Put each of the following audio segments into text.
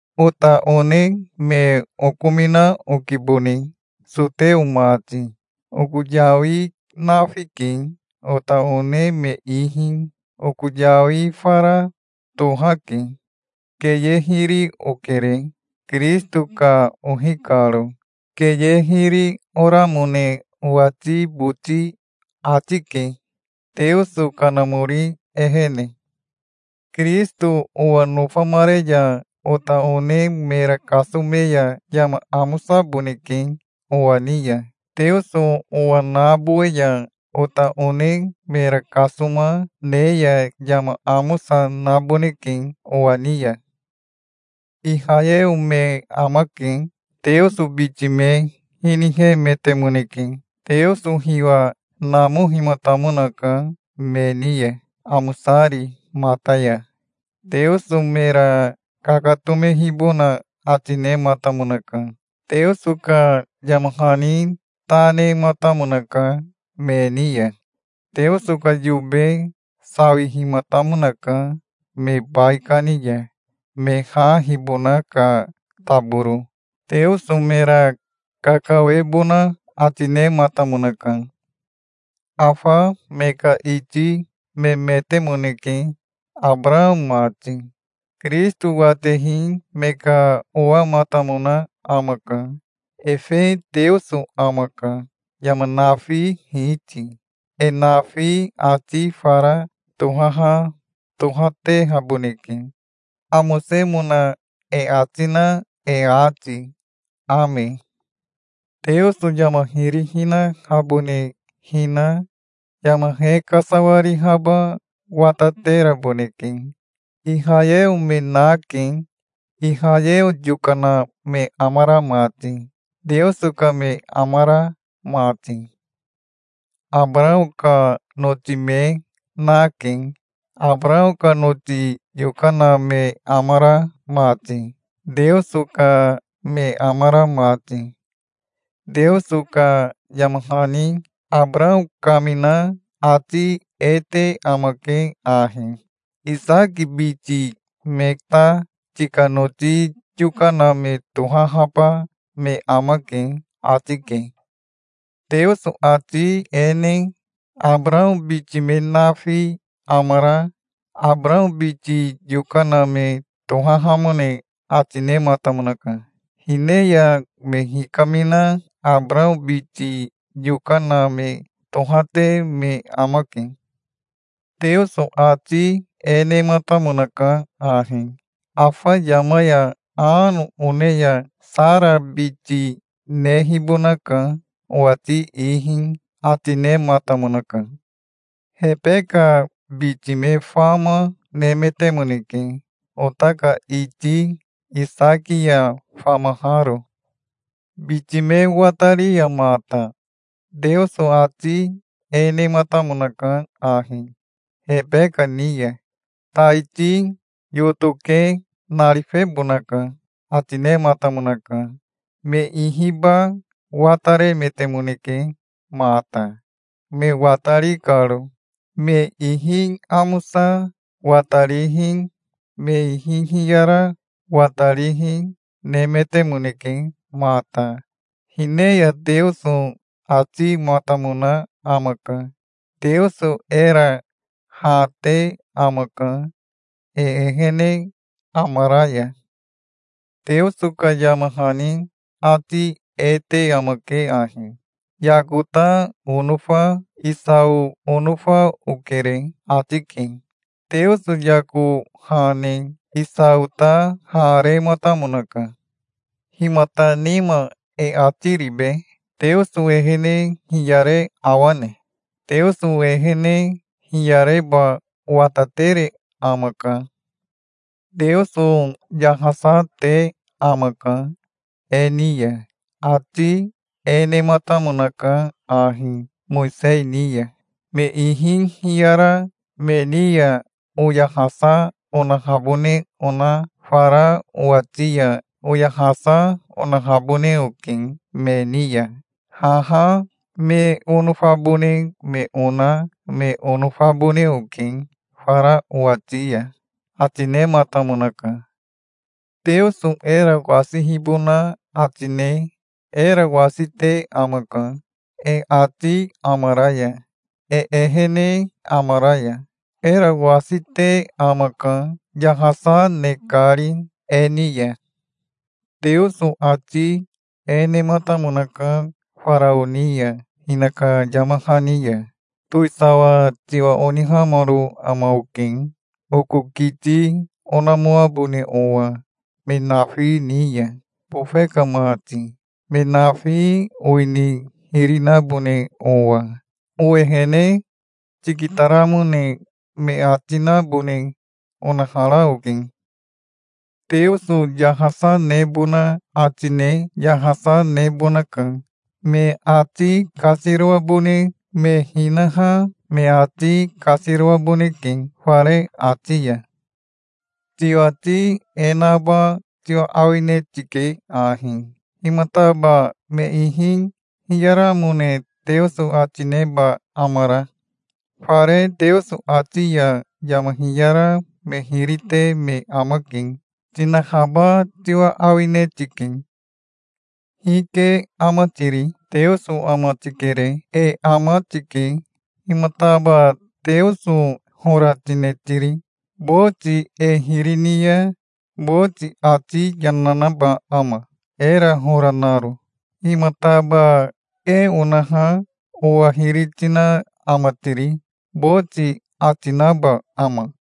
Ota one me okomina okibone, soteo mati. Oko yawi nafike, ota one me ihi. Oko yawi fara tohake. Keye hiri okere, Kirisito ka ohi karo. Keye hiri oramone owati boti ati, ke, Teoso Kanamori ehene. Kirisito owa nofamare ya ota one mera kasome ya yama amosaboneke owa ni ya. Teoso owa nabowe ya ota one mera kasoma ne ya yama amosa naboneke owa ni ya. Ihayeo me amake. Teoso biti me hinihemetemoneke. Teoso hiwa namohimatamonaka me ni ya, amosari mata ya. Teoso mera kakatomehibona ati nematamonaka. Teoso ka yama hani ta nematamonaka me ni ya. Teoso ka yobe sawihimatamonaka me baikani ya, me ha hibona ka taboro. Teoso mera kakawebona ati nematamonaka. Afa me ka iti memetemoneke, Abarao mati. Kirisito watehi me ka owamatamona amaka. Efe Teoso amaka, yama nafi Hiti. E nafi ati fara tohaha tohatehaboneke, amosemona e ati na e ati. Ame. Teoso yama hiri hinahabone hina yama he kasawarihaba watateraboneke. Ihayeo me nake, Ihayeo yokana me amara mati, Teoso ka me amara mati. Abarao ka noti me na, ke, Abarao ka noti yokana me amara mati, Teoso ka me amara mati. Teoso ka yama hani Abarao kamina ati e te amake ahi: "Isaki biti me ta tika noti yokana me tohahaba me amake", ati ke. Teoso ati e ne Abarao biti me nafi amara Abarao biti yokana me tohahamone ati nematamonaka. Hine ya me hikamina Abarao biti yokana me tohate me amake. Teoso ati e nematamonaka ahi: "Afa yama ya ano one ya Sara biti nehibonaka, owati ihi", ati nematamonaka. Hebeka biti me fama nemetemoneke, ota ka iti Isaki ya famaharo. Biti me watari ya mata Teoso ati e nematamonaka ahi Hebeka ni ya: "Taiti yoto ke narifebonaka", ati nematamonaka. Me ihiba wataremetemoneke mata, me watari karo. Me ihi amosa watarihi me ihi hiyara watarihi nemetemoneke mata. Hine ya Teoso atimatamona amaka. Teoso era ha te amaka, e ehene amara ya. Teoso ka yama hani ati e te amake ahi: "Yako ta onofa Isao onofa okere", ati ke. Teoso Yako ha ne Esao ta ha rematamonaka. Himata nima e ati ribe? Teoso ehene hiyare awane? Teoso ehene hiyareba watatere amaka. Teoso yahasa te amaka e ni ya. Ati e nematamonaka ahi Mowisei ni ya: "Me ihi hiyara me ni ya oyahasa onahabone ona fara owati ya oyahasa onahabone oke me ni ya. Haha me onofabone me ona me onofabone oke fara owati ya", ati nematamonaka. Teoso era wasihibona ati ne era wasite amaka, e ati amara ya, e ehene amara ya. Era wasite amaka, yahasa ne kari e ni ya. Teoso ati e nematamonaka Farao ni ya, hinaka yama hani ya: "Towisawa tiwa onihamaro ama oke, oko kiti onamoabone owa me nafi ni ya, bofe ka mati, me nafi owini hiri nabone owa. Owehene tikitaramone me ati nabone onahara oke". Teoso yahasa nebona ati ne yahasa nebonaka. Me ati kasiroabone me hinaha me ati kasiroaboneke fare ati ya. Tiwati e naba tiwa awine tike ahi: "Himataba me ihi hiyaramone Teoso ati neba amara? Fare Teoso ati ya yama hiyara me hiri te me amake", tinahaba tiwa awine tike. Hike ama tiri? Teoso ama tikere. E ama tike. Himataba Teoso hora tine tiri? Boti e hiri ni ya boti ati yana naba ama, era hora naro? "Himataba e onaha owa hiri tina ama tiri?" boti ati naba ama?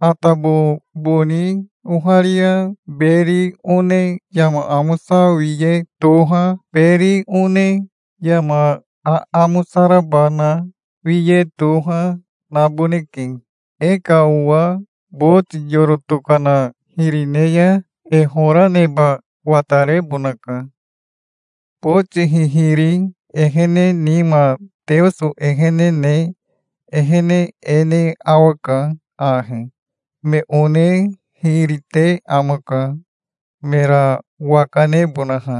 Atabo boni oharia beri one yama amosa wiye toha, beri one yama aamosa raba na wiye toha, naboneke. E ka owa boti yoro tokana hiri ne ya e hora neba watarebonaka. Boti hihiri ehene nima Teoso ehene ne ehene e ne awaka ahi: me one hiri te amaka, mera waka nebonaha.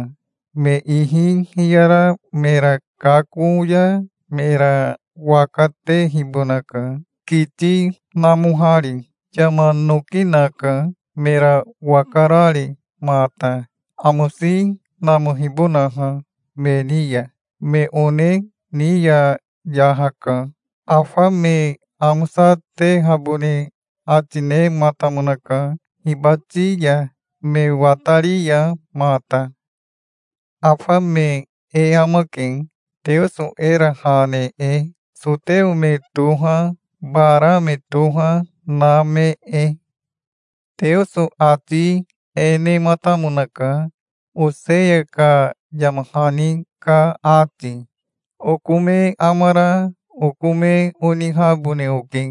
Me ihi hiyara mera kako ya mera waka tehibonaka, kiti namohari. Yama noki naka, mera waka rari mata, amosi namohibonaha me ni ya. Me one ni ya yahaka. Afa me amosatehabone ati nematamonaka hibati ya, me watari ya mata. Afa me e amake, Teoso era ha ne e, soteo me toha, bara me toha, na me e. Teoso ati e nematamonaka Oseya ka yama hani ka ati: "Oko me amara oko me onihabone oke.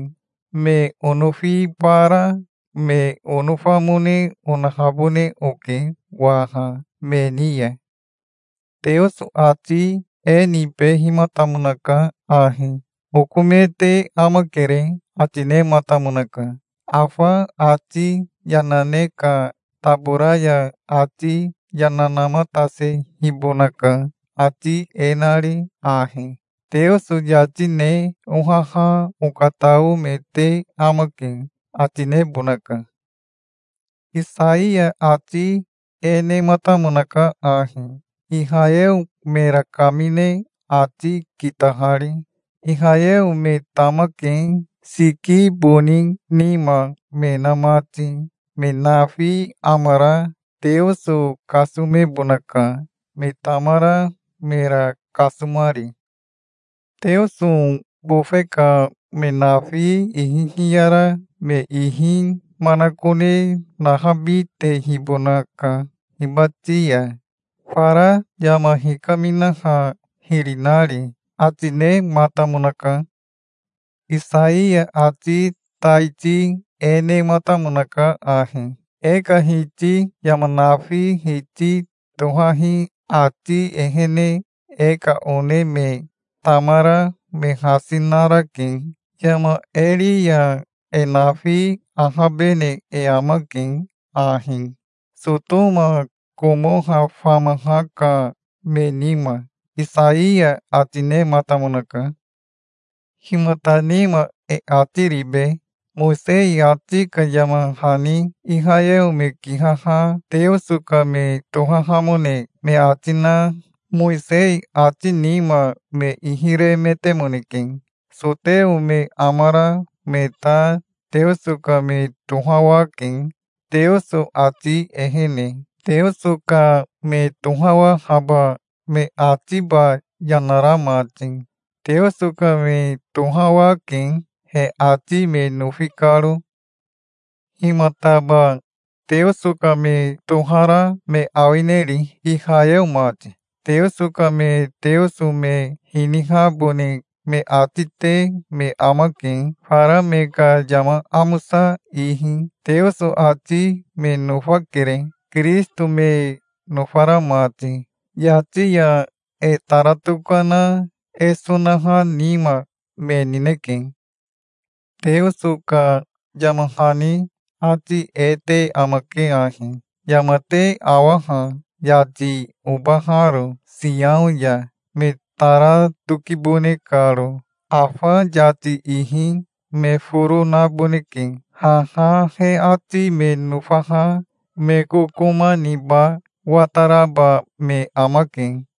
Me onofibara me onofamone onahabone oke waha me ni ya". Teoso ati e nibehimatamonaka ahi: "'Oko me te amakere', ati nematamonaka. Afa ati yana ne ka tabora ya ati yana namatasehibonaka, ati e nari ahi: 'Teoso yati ne ohaha okatao me te amake', ati nebonaka". Isaiya ati e, nematamonaka ahi, Ihayeo mera kamine ati kitahari: "Ihayeo me tamake, siki boni nima me na mati. Me nafi amara Teoso kasomebonaka, me tamara mera kasomari. Teoso bofe ka me nafi ihi hiyara me ihi manakone nahabitehibonaka hibati ya, fara yama hikaminaha hiri nari", ati nematamonaka. Isaiya ati taiti e nematamonaka ahi: "E ka Hiti yama nafi Hiti tohahi ati ehene e ka one me tamara me hasi narake. Yama e ri ya, e nafi ahabene e amake ahi, Sotoma Komoha famaha ka me nima", Isaiya ati nematamonaka. Himata nima e ati ribe? Mowisei ati ka yama hani Ihayeo me kihaha Teoso ka me tohahamone me ati na Mowisei ati nima me ihi remetemoneke. Soteo me amara me ta Teoso ka me tohawake, Teoso ati ehene, Teoso ka me tohawahaba me atiba yana ra mati. Teoso ka me tohawake, he ati me nofi karo. Himataba Teoso ka me tohara me awineri, Ihayeo mati? Teoso ka me Teoso me hinihabone me ati te me amake, fara me ka yama amosa ihi. Teoso ati me nofakere, Kirisito me nofara mati. Yati ya e tara tokana e sonaha nima me nineke. Teoso ka yama hani ati e te amake ahi: "Yama te awa ha, yati, obaharo Siao ya, me tara tokibone karo. Afa yati ihi me foro naboneke. Haha he ati me nofaha me kokoma niba wataraba me amake".